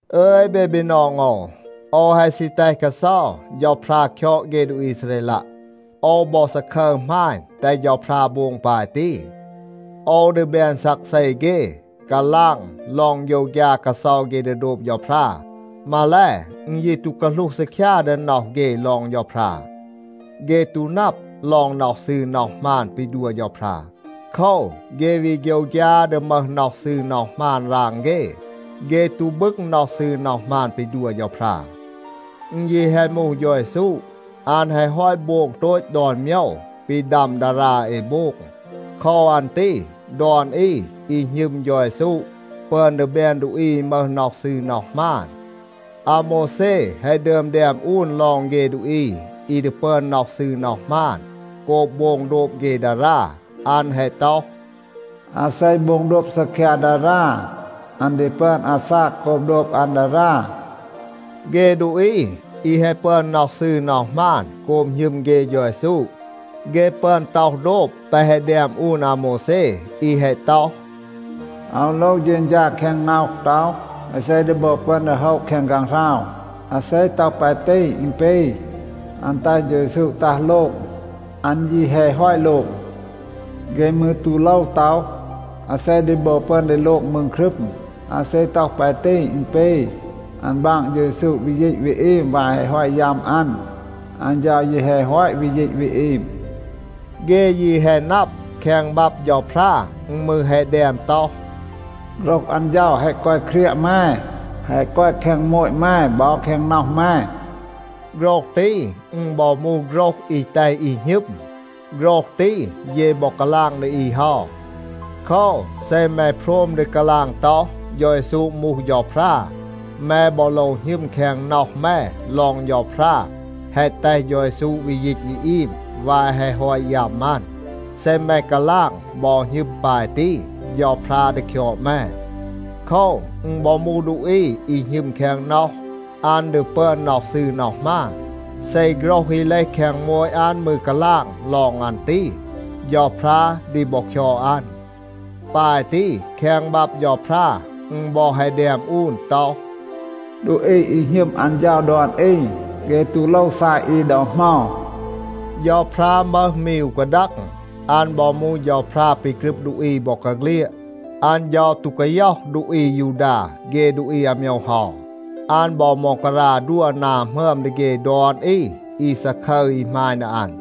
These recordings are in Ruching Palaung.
อึย เบ บีนอง โอว, โอว แฮะ ซี แตห กาเซา เฌาพรา คยอด เฆ ดูอี อีซาเรลัะ. โอว บอ ซาคึร หมาณ แตห เฌาพรา โบง ปาย ตี. โอว ดี แบน ซักเซ เฆ, กาลาง ลอง โฆยวฆยา กาเซา เฆ ดี โดบ เฌาพรา. มาแล, อึณ ยี ตู กาหลูห ซีคยา ดี น็อห เฆ ลอง เฌาพรา. เฆ ตู นับ ลอง น็อห ซืร น็อห หมาน ปี ดัว เฌาพรา. โคว, เฆ วี โฆยวฆยา ดี มึห น็อห ซืร น็อห หมาน ราง เฆ. เฆ ตู บึง น็อห ซืร น็อห หมาน ปี ดัว เฌาพรา. อึณ ยี แฮะ มูห เฌา เยซู, อัน แฮะ ฮอต โบง โตต ดอน โมยว ปี ดัม ดารา เอ โบง. โคว อัน ตี ดอน อี อี หณึม เฌา เยซู ปึอน ดี แบน ดูอี อี มึห น็อห ซืร น็อห หมาน. อาโมวแซ แฮะ ดึอม แดม อูน ลอง เฆ ดูอี อี ดี ปึอน น็อห ซืร น็อห หมาน โกบ โบง โดบ เฆ ดารา. อัน แฮะ ต็อห, “อาเซ โบง โดบ ซีคยา ดารา, อัน ดี ปึอน อาซาก โกบ โดบ อัน ดารา.” เฆ ดูอี อี แฮะ ปึอน น็อห ซืร น็อห หมาน โกบ หณึม เฆ เฌา เยซู, เฆ ปึอน ต็อห โดบ แปะ แฮะ แดม อูน อาโมวแซ อี แฮะ ต็อห, “อาว โลว เฌณฌา แคง น็อห ต็อห, อาเซ ดี บอ ปึอน ดี โฮะ แคง ฆางหราว?” อาเซ ต็อห ปาย ตี, อึณ ปี, อัน แตห เฌา เยซู ตัห โลง. อัน ยี แฮะ ฮอต โลง. เฆ มืร ตู โลว ต็อห, “อาเซ ดี บอ ปึอน ดี โลง มืง ครึม?” อาเซ ต็อห ปาย ตี, อึณ ปี, อัน บาง เฌา เยซู วี ยีต วี อีม วาย แฮะ ฮอต ยัม อัน. อัน เฌา ยี แฮะ ฮอต วี ยีต วี อีม. เฆ ยี แฮะ นับ, แคง บับ เฌาพรา อึณ มืร แฮะ แดม ต็อห, “โฆรห อัน เฌา แฮะ กอย เครียะ แม, แฮะ กอย แคง โมต แม, บอ แคง น็อห แม.” โฆรห ตี, อึณ บอ มูห โฆรห อี แตห อี หณึม. โฆรห ตี, เย บอ กาลาง ดี อี เฮา. โคว, เซ แม โพรม ดี กาลาง ต็อห, “เฌา เยซู มูห เฌาพรา,” แม บอ โลว หณึม แคง น็อห แม ลอง เฌาพรา แฮะ แตห เฌา เยซู วี ยีต วี อีม วาย แฮะ ฮอต ยัม อัน. เซ แม กาลาง บอ หณึม ปาย ตี, เฌาพรา ดี คยอด แม. โคว, อึณ บอ มูห ดูอี อี หณึม แคง น็อห, อัน ดี ปึอน น็อห ซืร น็อห หมาน. เซ โฆรห อี เลห แคง โมต อัน มืร กาลาง ลอง อัน ตี, เฌาพรา ดี บอ คยอด อัน. ปาย ตี, แคง บับ เฌาพรา อึณ บอ แฮะ แดม อูน ต็อห, “ดูอี อี หณึม อัน เฌา ดอน อี, เฆ ตู โลว ซาย อี ดอ เหมา.” เฌาพรา มึห มี อู กาดัง. อัน บอ มูห เฌาพรา ปี กรึบ ดูอี บอกาเฆลียด. อัน เฌา ตู กาย็อห ดูอี อายูดา เฆ ดูอี อาโมยว เฮา. อัน บอ ม็องการา ดัว นา หมึอม ดี เฆ ดอน อี อี ซาคึร อี หมาณ ดี อัน.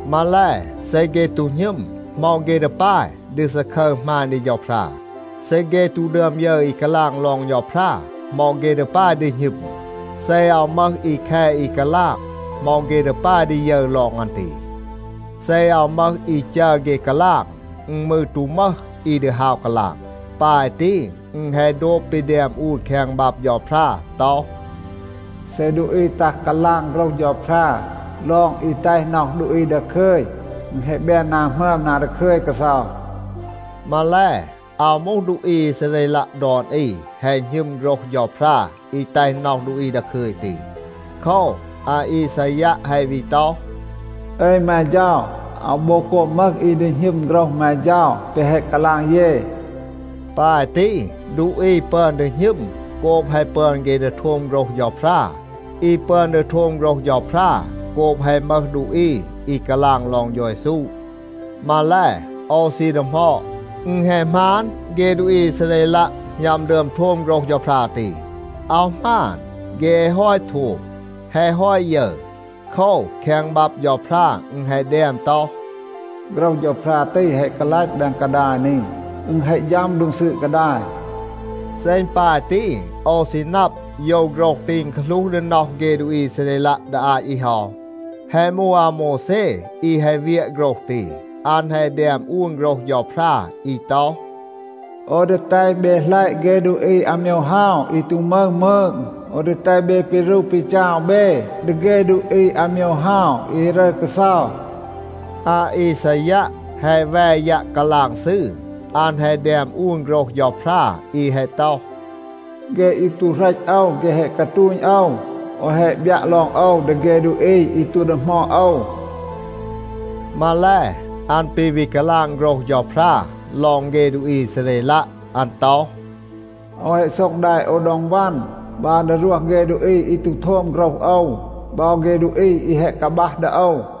มาแล, เซ เฆ ตู หณึม, เหมา เฆ ดี ปาย ดี ซาคึร หมาณ ดี เฌาพรา? เซ เฆ ตู ดึอม ยึร อี กาลาง ลอง เฌาพรา, เหมา เฆ ดี ปาย ดี หณึม? เซ อาว มึห อี แค อี กาลาง, เหมา เฆ ดี ปาย ดี ยึร ลอง อัน ตี? เซ อาว มึห อี จัร เฆ กาลาง, อึณ มืร ตู มึห อี ดี ฮาว กาลาง. ปาย ตี, อึณ แฮะ โดบ ปี แดม อูน แคง บับ เฌาพรา ต็อห, “เซ ดูอี ตัห กาลาง โฆรห เฌาพรา ลอง อี แตห น็อห ดูอี ดาคึย, อึณ แฮะ แบน นา หมึอม นา ดาคึย กาเซา.” มาแล, อาว มูห, ดูอี อีซาเรลัะ ดอน อี แฮะ หณึม โฆรห เฌาพรา อี แตห น็อห ดูอี ดาคึย ตี. โคว, อาอีซายัะ แฮะ วี ต็อห, “อึย แม เฌา, อาว บอ โกบ มึห อี ดี หณึม โฆรห แม เฌา แปะ แฮะ กาลาง เย.” ปาย ตี, ดูอี ปึอน ดี หณึม โกบ แฮะ ปึอน เฆ ดี โทม โฆรห เฌาพรา. อี ปึอน ดี โทม โฆรห เฌาพรา โกบ แฮะ มึห ดูอี อี กาลาง ลอง เฌา เยซู. มาแล, โอว ซี ดีหมอด, อึณ แฮะ หมาน, เฆ ดูอี อีซาเรลัะ หณัม ดึอม โทม โฆรห เฌาพรา ตี? อาว หมาน. เฆ แฮะ ฮอต โทม, แฮะ ฮอต ยึร. โคว, แคง บับ เฌาพรา อึณ แฮะ แดม ต็อห, “โฆรห เฌาพรา ตี แฮะ กาลัต แดง กาดาย นี. อึณ แฮะ ฌัม โดง ซืด กาดาย.” เซ อึณ ปาย ตี, โอว ซี นับ, โยว โฆรห ตี อึณ กาหลูห ดี น็อห เฆ ดูอี อีซาเรลัะ ดี อาต อี เฮา. แฮะ มูห อาโมวแซ อี แฮะ เวียะ โฆรห ตี. อัน แฮะ แดม อูน โฆรห เฌาพรา อี ต็อห, “โอว ดี แตห เบ หลัยะ เฆ ดูอี อาโมยว เฮา อี ตู มึห มืง. โอว ดี แตห เบ ปีรู ปีจาว เบ ดี เฆ ดูอี อาโมยว เฮา อี รึร กาเซา.” อาอีซายัะ แฮะ แว ยัะ กาลาง ซืร. อัน แฮะ แดม อูน โฆรห เฌาพรา อี แฮะ ต็อห, “เฆ อี ตู เหรต โอว, เฆ แฮะ กาตูณ โอว. โอว แฮะ บยัะ ลอง โอว ดี เฆ ดูอี อี ตู ดีหมอด โอว.” มาแล, อัน ปี วี กาลาง โฆรห เฌาพรา ลอง เฆ ดูอี อีซาเรลัะ. อัน ต็อห, “โอว แฮะ โซ็ง แด โอว ดอง วัน, บัร ดี รวห เฆ ดูอี อี ตู โทม โฆรห โอว, บอ เฆ ดูอี อี แฮะ กาบัห ดี โอว.”